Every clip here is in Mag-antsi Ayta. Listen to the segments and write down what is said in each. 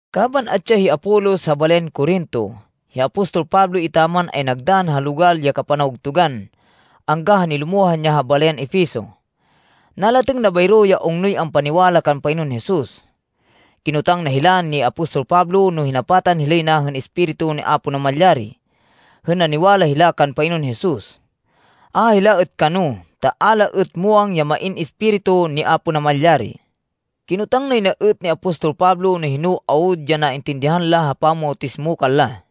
Kaban atsi ya hi Apolos ha balayan Corinto, hi apostol Pablo etaman ay nagdann ha logal ya kapanawgtugan angga ha nilumohan ya ha balayan Efeso. Nalatêng na bayro ya ungnoy ampaniwala kan Panginoon Jesus. Kinotang na hila ni apostol Pablo no hinapatan hilay na hên Espiritu ni Apo Namalyari, hên naniwala hila kan Panginoon Jesus. A hila êt kano, ta a la êt muwang ya main Espiritu ni Apo Namalyari. Kinotang nay na êt ni apostol Pablo no hino awud ya naintindihan la ha pamawtismo kanla.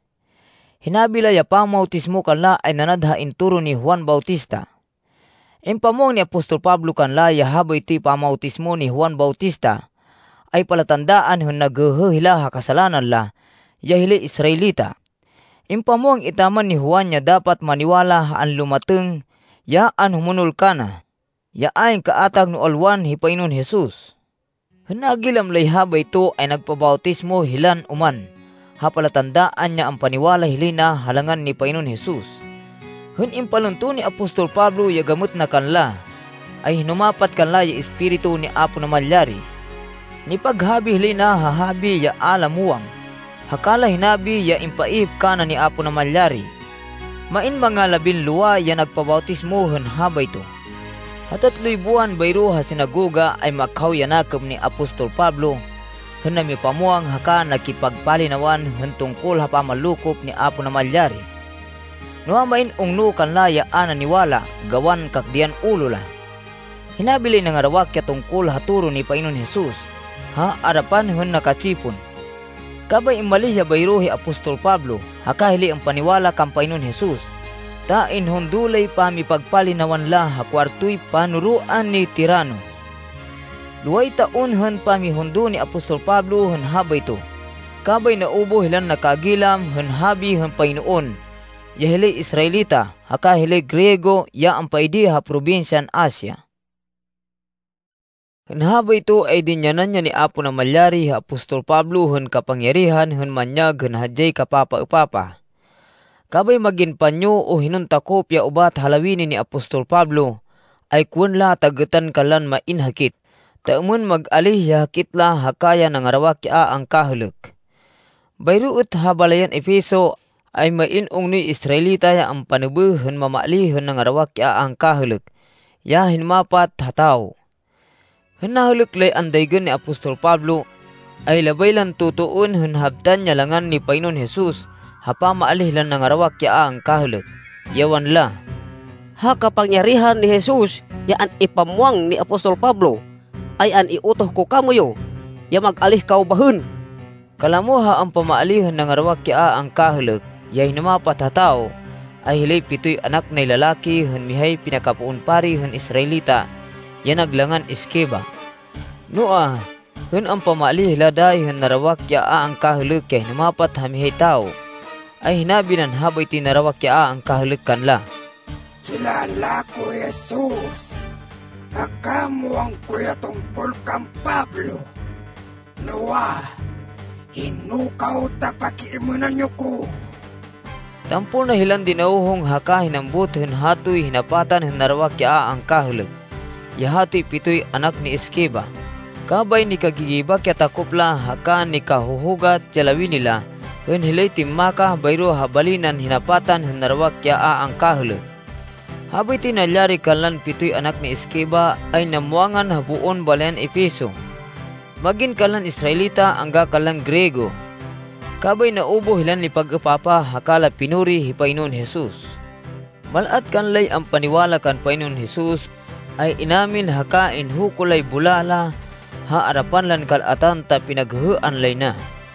Hinabi la ya pamawtismo kanla ay nanad ha intoro ni Juan Bautista. Impamwang ni apostol Pablo kanla ya habaytoy pamawtismo ni Juan Bautista, ay palatandaan hên naghêhê hila ha kasalanan la ya hilay Israelita. Impamwang etaman ni Juan ya dapat maniwala ha anlumatêng ya anhumonol kana, ya ayn kaatag no alwan hi Panginoon Jesus. Hên nagilam lay habayto, ay nagpabawtismo hilan oman ha palatandaan ya ampaniwala hilay na ha langan ni Panginoon Jesus. Hên impalunto ni apostol Pablo ya gamêt na kanla, ay hinumapat kanla ya Espiritu ni Apo Namalyari. Nipaghabi hilay na ha habi, ya a la muwang, haka la hinabi ya impaihip kana ni Apo Namalyari. Main manga labinlowa ya nagpabawtismo hên habayto. Ha tatloy buwan bayro ha sinagoga, ay makhaw ya nakêm ni apostol Pablo hên namipamwang haka nakipagpalinawan hên tungkol ha pamanlokop ni Apo Namalyari. Noa, main ungno kanla ya a naniwala gawan kakdêyan ulo la. Hinabi lay nangarawak ya tungkol ha toro ni Panginoon Jesus ha arapan hên naka-tsipon. Kabay immalíh ya bayro hi apostol Pablo haka hilay ampaniwala kan Panginoon Jesus, ta inhundo lay pamipagpalinawan la ha kuwartoy panoroan ni Tirano. Loway taon hên pamihundo ni apostol Pablo hên habayto, kabay naubuh hilan nakagilam hên habi hên Panginoon ya hilay Israelita, haka hilay Griego ya ampaidi ha probinsyan Asia. Hên habayto ay dinyanan ya ni Apo Namalyari hi apostol Pablo hên kapangyarihan hên manyag hên hadyay kapapaêpapah. Kabay mag-in panyo o hinon takop ya ubat ha lawini ni apostol Pablo, ay kowên la ta gêtan kanlan main hakit, ta êmên mag-alíh ya hakit la haka ya nangarawak ya a angkahêlêk. Bayro êt ha balayan Efeso, ay main ungnoy Israelita ya ampanêbêh hên mamaalíh hên nangarawak ya a angkahêlêk ya hinumapat ha tawo. Hên nahêlêk lay andaygên ni apostol Pablo, ay labay lan totoên hên habtan ya langan ni Panginoon Jesus ha pamaalíh lan nangarawak ya a angkahêlêk, ya wanla, “Ha kapangyarihan ni Jesus ya an-ipamwang ni apostol Pablo, ay an-iutoh ko kamoyu ya mag-alíh kaw bahên.” Kalamo ha ampamaalíh hên nangarawak ya a angkahêlêk ya hinumapat ha tawo, ay hilay pitoy anak nay lalaki hên mihay pinakapoon pari hên Israelita ya nag langan Esceva. Noa, hên ampamaalíh hila dayi hên narawak ya a angkahêlêk ya hinumapat ha mihay tawo, ay hinabi nan habaytoy narawak ya a angkahêlêk kanla, “Kilala ko hi Jesus haka muwang ko ya tungkol kan Pablo. Noa, hino kaw ta pakiêmênan yo ko!” Tampol na hilan dinawhong haka hinambut hên hatoy hinapatan hên narawak ya a angkahêlêk ya hatoy pitoy anak ni Esceva, kabay nikagigibak ya takop la haka nikahuhugat ya lawini la hên hilay timmakah bayro ha bali nan hinapatan hên narawak ya a angkahêlêk. Habaytoy nalyari kanlan pitoy anak ni Esceva ay namwangan ha boon balayan Efeso, mag-in kanlan Israelita angga kanlan Griego. Kabay naubuh hilan nipag-êpapah haka la pinuri hi Panginoon Jesus. Mal-at kanlay ampaniwala kan Panginoon Jesus, ay inamin haka inhuko lay bulá la ha arapan lan kal-atan ta pinaghêhêan lay na.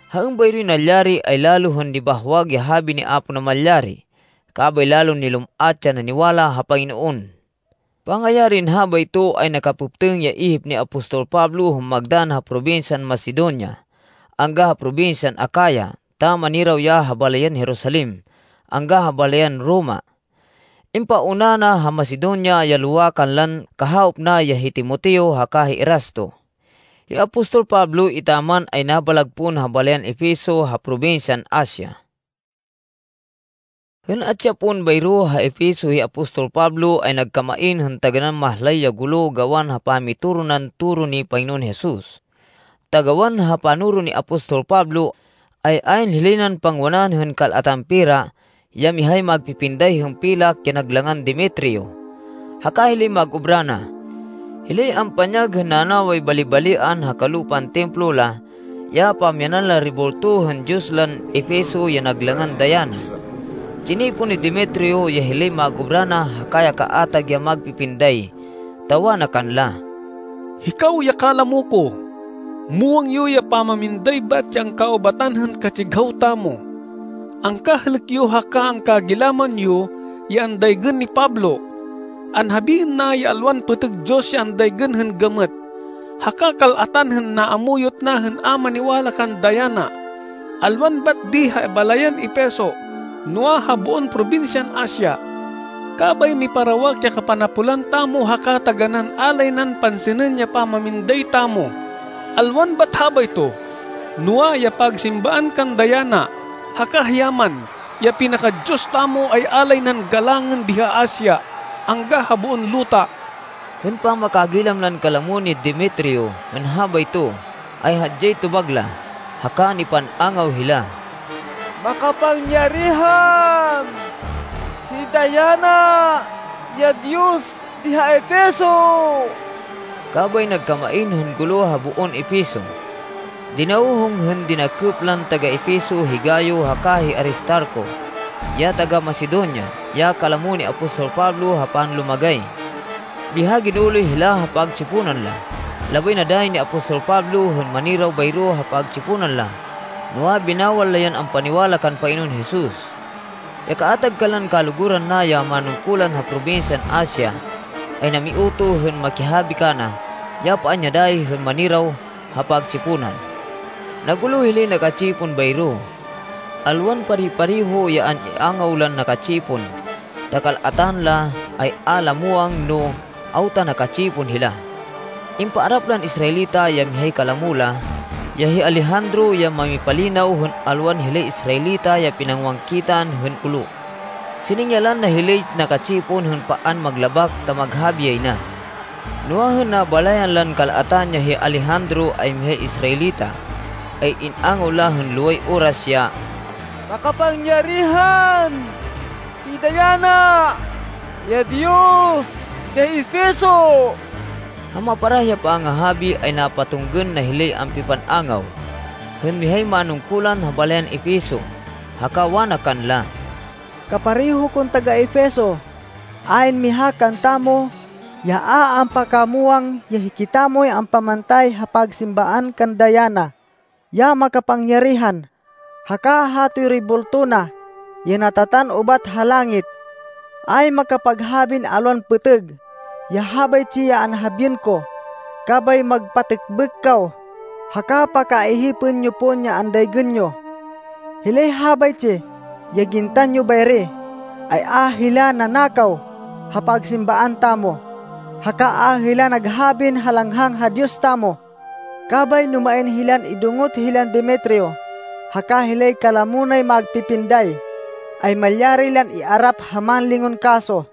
Ha êmbayroy nalyari, ay lalo hên nibahwag ya habi ni Apo Namalyari, kabay lalon nilum-at ya naniwala ha Panginoon. Pangayarin habayto, ay nakapêptêng ya ihip ni apostol Pablo hên magdann ha probinsyan Macedonia angga ha probinsyan Acaya ta maniraw ya ha balayan Jerusalem angga ha balayan Roma. Impauna na ha Macedonia ya lowa kanlan kahawop na ya hi Timoteo haka hi Erasto. Hi apostol Pablo etaman ay nabalag pon ha balayan Efeso ha probinsyan Asia. Hên atsi ya pon bayro ha Efeso hi apostol Pablo ay nagkamain hên taganán mahlay ya gulo gawan ha pamitoro nan toro ni Panginoon Jesus. Ta gawan ha panoro ni apostol Pablo, ay ayn hilay nan pangwanan hên kal-atan pera ya mihay magpipinday hên pilak ya nag langan Demetrio haka hilay mag-obra na. Hilay ampanyag hên nanaway bali-balian ha kalupan templo la ya pamyanan lan rebulto hên diyos lan Efeso ya nag langan Diana. Tsinipon ni Demetrio ya hilay mag-obra na haka ya kaatag ya magpipinday ta wana kanla, “Hikaw ya kalamo ko, muwang yo ya pamaminday bat ya angkaubatan hên katsighaw tamo. Angkahêlêk yo haka angkagilaman yo ya andaygên ni Pablo. Anhabiên na ya alwan pêtêg diyos ya andaygên hên gamêt, haka kal-atan hên naamuyot na hên a maniwala kan Diana, alwan bat di ha balayan Efeso, noa, ha boon probinsyan Asia. Kabay miparawak ya kapanapolan tamo haka taganán a lay nan pansinên ya pamaminday tamo. Alwan bat habayto, noa, ya pagsimbaan kan Diana, haka hiya man, ya pinaka-diyos tamo, ay a lay nan galangên di ha Asia angga ha boon luta.” Hên pamakagilam lan kalamo ni Demetrio hên habayto, ay hadyay tobag la, haka nipan-angaw hila, “Makapangyarihan hi Diana ya diyos di ha Efeso!” Kabay nagkamain hên gulo ha boon Efeso. Dinawhong hên dinakêp lan taga-Efeso hi Gayo haka hi Aristarco ya taga-Macedonia, ya kalamo ni apostol Pablo ha panlumagay. Biha ginuloy hila ha pagtsiponan la. Labay na dayi ni apostol Pablo hên maniraw bayro ha pagtsiponan la, noa, binawal la yan ampaniwala kan Panginoon Jesus. Ya kaatag kanlan kaluguran na ya manungkulan ha probinsyan Asia ay namiutoh hên makihabi kana ya paan ya dayi hên maniraw ha pagtsiponan. Nagulo hilay naka-tsipon bayro. Alwan pare-pareho ya an-iangaw lan naka-tsipon, ta kal-atan la ay a la muwang no awta naka-tsipon hila. Impaarap lan Israelita ya mihay kalamo la, ya hi Alejandro ya mamipalinaw hên alwan hilay Israelita ya pinangowangkitan hên gulo. Siningyalan na hilay naka-tsipon hên paan maglabak ta maghabi yay na. Noa, hên nabalayan lan kal-atan ya hi Alejandro ay mihay Israelita, ay in-angaw la hên loway oras ya, “Makapangyarihan hi Diana ya diyos di ha Efeso!” Ha maparah ya pangahabi, ay napatunggên na hilay ampipan-angaw, hên mihay manungkulan ha balayan Efeso. Haka wana kanla, “Kapareho kon taga-Efeso, ayn miha kantamo ya a ampakamwang ya hikitamoy ampamantay ha pagsimbaan kan Diana, ya makapangyarihan, haka hatoy rebulto na ya natatan ubat ha langit. Ayn makapaghabin alwan pêtêg ya habaytsi ya anhabiên ko, kabay magpatêkbêk kaw haka pakaihipên yo pon ya andaygên yo. Hilay habaytsi ya gintan yo bayri, ay a hila nanakaw ha pagsimbaan tamo, haka a hila naghabin halanghang ha diyos tamo. Kabay no main hilan idungot hilan Demetrio haka hilay kalamo nay magpipinday, ay malyari lan iarap ha mánlingon kaso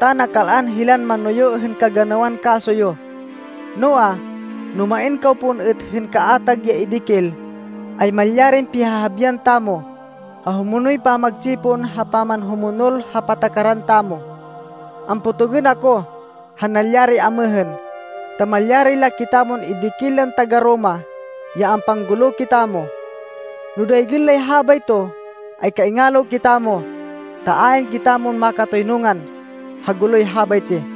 ta nakal-an hilan manoyo hên kaganawan kaso yo. Noa, no main kaw pon êt hên kaatag ya idikil, ay malyarin pihahabian tamo ha humonoy pamagtsipon ha pamanhumonol ha patakaran tamo. Ampotogên ako ha nalyari amêhên, ta malyari la kitamon idikil lan taga-Roma ya ampanggulo kitamo. No daygên lay habayto, ay kaingalo kitamo, ta ayn kitamon makatoynungan ha guloy habaytsi.”